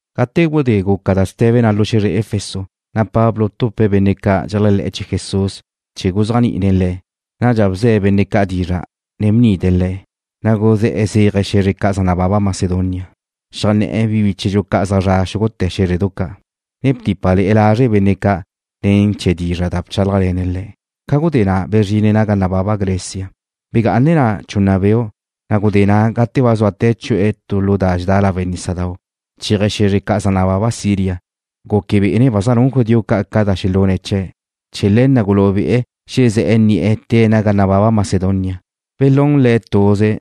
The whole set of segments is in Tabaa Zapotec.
Gate gudé guca da ste̱be na' lu xe̱zre Efeso, na' Pablo btupe̱' benne' ca' dxeléajle̱'e̱ chee̱ Jesús chee̱ guzéajni'ine̱' le̱'. Nadxa bze̱' benne' ca' dizra', ne bnide̱' le̱', na' guzé̱'e̱ zéaje̱' xe̱zre ca' zaj nababa Macedonia. Xeajné̱'e̱ bíchedxu ca' zaj zre̱'e̱ xúgute̱ xé̱zredu ca', ne btípale̱'e̱ lazre' benne' ca' ne̱ chee̱ dizra' da bchálajle̱ne̱' le̱'. Ca gudé na' bezrine̱' naga nababa Grecia. Begá'ane̱' na' chunna beu', na' gudé na' gate ba zuate̱' chu'e̱ tu lu da dxedá lawe' nísadau' chéaje̱' xe̱zre ca' zaj nababa Siria, guque bé'ene̱' ba zaj nun judío ca' ca da xelune̱' chee̱'. Chee̱ le̱ na' gulú'u bi'e̱ xezé̱'e̱ ni'e̱ tée̱' naga nababa Macedonia. Belún le̱' tuze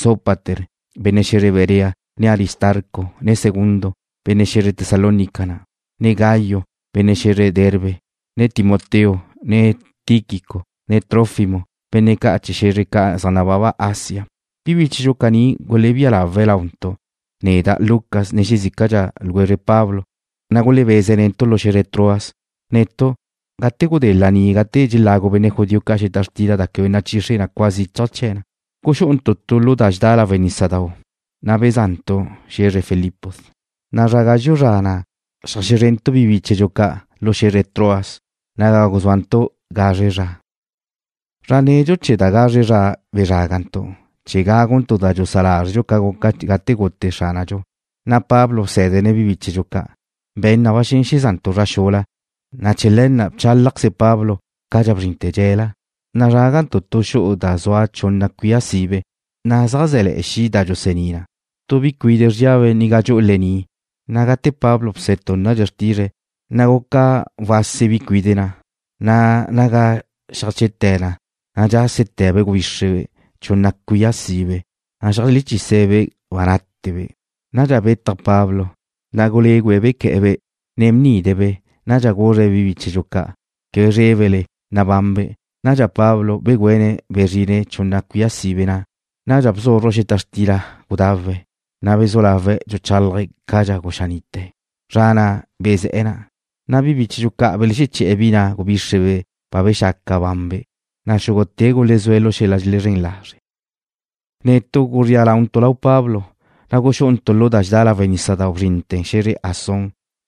Sópater, benne' xe̱zre Berea, ne Aristarco, ne Segundo, benne' xe̱zre Tesalónica na', ne Gayo, benne' xe̱zre Derbe, ne Timoteo, ne Tíquico, ne Trófimo, benne' ca' chee̱ xe̱zre ca' zaj nababa Asia. Bi bíchedxu caní gulebía lawe̱' launtu', neda', Lucas, ne xezícadxa ljwezre Pablo, na' gulebeze̱' netu' lu xe̱zre Troas. Netu', gate gudé laní gate dxelagu benne' judío xeta xtila da quebe nachixre cua zichaj chee̱ na, guxú'untu' tu lu da dxedá lawe' nísadau', na' beza'ntu' xe̱zre Filipos. Zra gazxu' zra na' xeajzrentu' bi bíchedxu ca' lu xe̱zre Troas, naga guzúantu' gazre zra. Zra nedxu chee̱ da gazre zra bezrágantu' chee̱ gáguntu' da dxusá lázredxu ca guca gate gute Xránadxu, na' Pablo bsé̱dene̱' bi bíchedxu ca'. Be̱n na ba xen xeza'ntu' zra xula, na' chee̱ le̱ na' bchálajqueze Pablo cadxa bzrinte̱ dxe̱la. Nazrágantu' tu xu'u da zua chunna cuía sibe, na' zaj zé̱le̱'e̱ xi' da dxulusení na. Tu bi cuide' zríabe' ga dxu'u lení', na' gate Pablo bsetúnnadxe̱' xrtizre̱', na' guca wásele̱'e̱ bi cuide' na', na' naga xeajchete̱ na, na' dxásete̱be' gubíxrebe' chunna cuía sibe, na' xeajlechise̱'-be' ba nátebe'. Nadxa betaj Pablo, na' gulégüe̱' bequé̱'e̱-be', ne bnide̱'-be'. Nadxa guzre̱' bi bíchedxu ca': ―Quebe zrébele. Nabanbe'. Nadxa Pablo begüéne̱' bezrine̱' chunna cuía sibe na'. Na' bzúzruje̱' xeta xtila gudawe̱', na' bezú lawe̱' dxuchálaje̱' cadxa guxaní'te̱. Zra na' bezé̱'e̱ na'. Nadxa bíchedxu ca' belexeché̱'e̱ bi na' gubíxrebe' ba bexaca banbe', na' xúgute̱' gulezúe̱' lu xel-la' dxelezrén lazre'. Netu' guzría launtu' lau Pablo, na' guxu'untu' lu da dxedá lawe' nísadau', na' bzrintu' xe̱zre Asón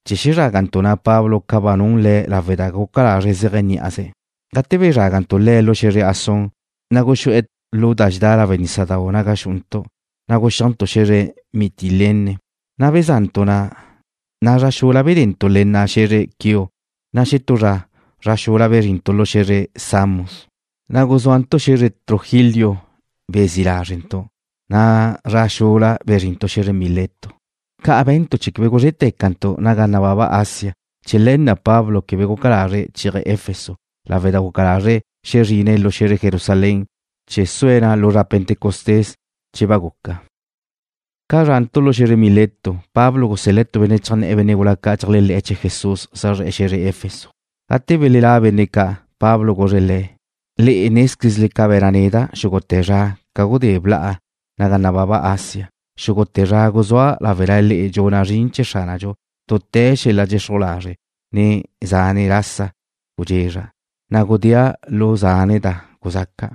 naga xezrágantu' Pablo ca ba nun le̱' lawe' da guca lazre̱' zéaje̱' ní'aze̱'. Gate bezrágantu' le̱' lu xe̱zre Asón, na' guxú'e̱ lu da dxedá lawe' nísadau' naga xu'untu', na' guxíajntu' xe̱zre Mitilene. Beza'ntu' na', na' zra xula bedentu' le nna' xe̱zre Quío, na' xetú zra, zra xula bezrintu' lu xe̱zre Samos. Na' guzúantu' xe̱zre Trogilio naga bezí' lázrentu', na' zra xula bzrintu' xe̱zre Mileto. Ca' be̱ntu' chee̱ quebe guzré'te̱cantu' naga nababa Asia. Chee̱ le̱ na' Pablo quebe guca lazre̱' chéaje̱' Efeso lawe' da guca lazre̱' xezrinze̱' lu xe̱zre Jerusalén chee̱ sue̱' na' lu zra Pentecostés che ba guca. Ca zrantu' lu xe̱zre Mileto, Pablo gusel-le̱' tu benne' cheajnné̱' benne' gula ca' dxeléajle̱'e̱ chee̱ Jesús zaj zre̱'e̱ xe̱zre Efeso. Gate belelá' benne' ca', Pablo guzre̱' le̱': ―Le'e nézquezle ca be̱na' neda' xúgute̱ zra ca gudé bla'a ga nababa Asia. Xúgute̱ zra guzúa' láwela le'e dxuna' zrin chee̱ Xránadxu dute̱ xel-la' dxexruj lazre', ne zane' lasa gudxezra', na' gudéa' lu zane' da guzxaca'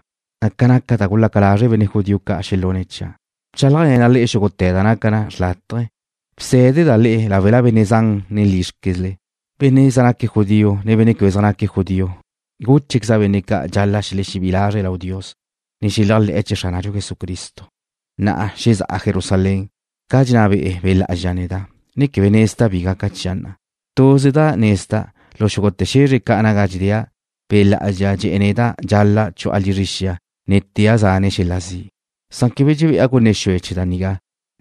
ca naca da gulaca lazre' benne' judío ca' xelune̱' chia'. Bchálajle̱na' le'e xúgute̱ da naca na xrlátaje, ne bsé̱deda' le'e láwela benne' zan, ne lízrquezle. Benne' zaj naque̱' judío, ne benne' quebe zaj naca judío, gúchequeza' benne' ca' dxal-la' xelexebí'i lazre̱' lau Dios, ne xeléajle̱'e̱ chee̱ Xránadxu Jesucristo. Na'a zexá'a Jerusalén, ca dxenná be'e Be' Lá'azxa neda', ne quebe nezda' bi gaca chia' na'. Tuze da nezda', lu xúgute̱ xe̱zre ca' naga dxedéa', Be' Lá'azxa dxe̱'e̱ neda' dxal-la' chu'a lizre xia, ne tea' zane' xel-la' zi'. Quebe dxebe'a gunne xue chee̱ da nigá,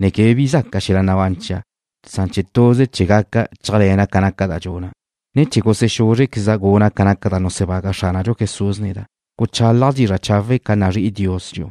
ne quebe bi zaca xel-la' nabán chia', san tuze che gaca chéajle̱na' ca naca da dxuna', ne chee̱ gusexúzrqueza' guna' ca naca da nusebaga Xránadxu Jesús neda', guchálaja' dizra' chawe' ca nazrí'i Dios dxi'u.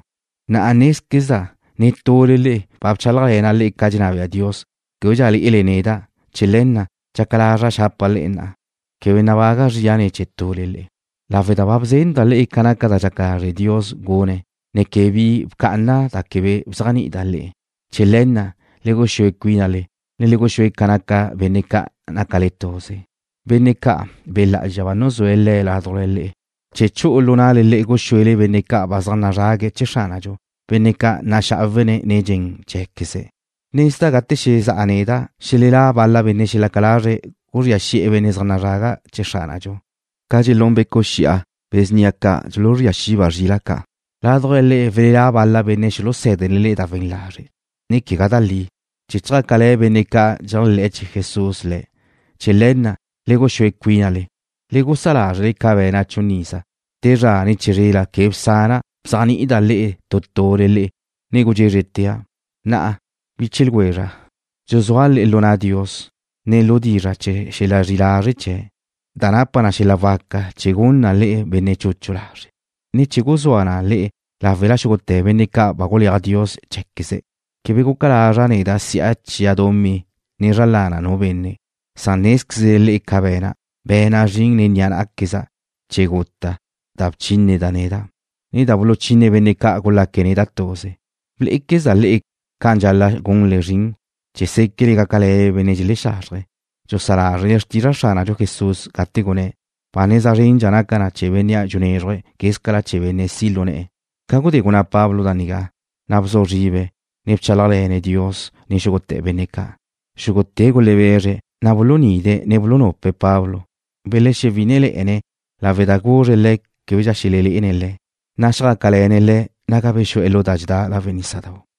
’Nézquezda' netule le'e, ba bchálajle̱na' le'e ca dxenná bea Dios, québedxa lé'ele neda'. Chee̱ le̱ na', dxaca lazra' xapa' le'e na'a, quebe nabaga' zria ne̱ chee̱ tule le'e, lawe' da ba bzenda' le'e ca naca da dxaca lazre' Dios gune̱', ne quebe bi bcá'ana' da quebe bzéajni'ida' le'e. Chee̱ le̱ na', le guxúe cuínale, ne le guxúe ca naca benne' ca' nácale tuze, benne' ca' Be' Lá'azxa ba nuzúe̱' le'e ládujla le̱' chee̱ chu'u lu na'le guxuele benne' ca' zaj nazrague̱' chee̱ Xránadxu, benne' ca' naxá'awene̱' nen dxen cheé̱queze̱'. Nezda' gate xezá'a neda' xelelá' bal-la benne' xelaca lazre̱' guzría xi'e̱ benne' zaj nazraga chee̱ Xránadxu ca dxelún becu' xi'a, be̱ snia ca' dxuluzría xiba' zrila' ca'. Ládujla le'e welelá' bal-la benne' xulusé̱dene̱' da we̱n lazre', ne quegá da li, chee̱ chjácale̱ benne' ca' dxeléajle̱'e̱ chee̱ Jesús le̱'. Chee̱ le̱ na', le guxúe cuínale. Le gusá' lázrele ca be̱na' chun iza, te zra ne chizrela quebe bsana' bzéajni'ida' le'e tu tule le'e, ne gudxézretea'. ’Na'a, biche ljwezra', dxuzúa' le'e lu na' Dios, ne lu dizra' chee̱ xel-la' zri'i lazre' chee̱', da napa na xel-la' waca chee̱ gun na le'e benne' chuchu lazre', ne chee̱ guzúa na le'e láwela xúgute̱ benne' ca' ba guleaj Dios cheé̱queze̱'. Quebe guca lazra' neda' si'a chia' dumí ne zra lana nu benne'. Nézquezle le'e ca be̱na', be̱na' zrin nen ni'a ná'queza' chee̱ guta' da guchínneda' neda', ne da gulechinne benne' ca' gulaque̱' neda' tuze. Blé'equezda' le'e, ca'an dxal-la' gunle zrin chee̱ séquele gácale̱le benne' dxelexazrje. Bsa lázrele xrtizra' Xránadxu Jesús, gate gunné̱': “Ba neza zrendxa naca na chee̱ benne' dxunezruj, quézcala chee̱ benne' si' lu ne̱'e̱.” Ca gudé gunná Pablo da nigá, na' bzu zribe̱', ne bchálajle̱ne̱' Dios nen xúgute̱ benne' ca'. Xúgute̱' gulebezre̱', na' bulunide̱', ne bulunupe̱' Pablo. Belexewí'inele̱'e̱ne̱' lawe' da guzre̱' le̱' québedxa xelelé'ene̱' le̱'. Na' xjácale̱ne̱' le̱' naga bexu'e̱ lu da dxedá lawe' nísadau'.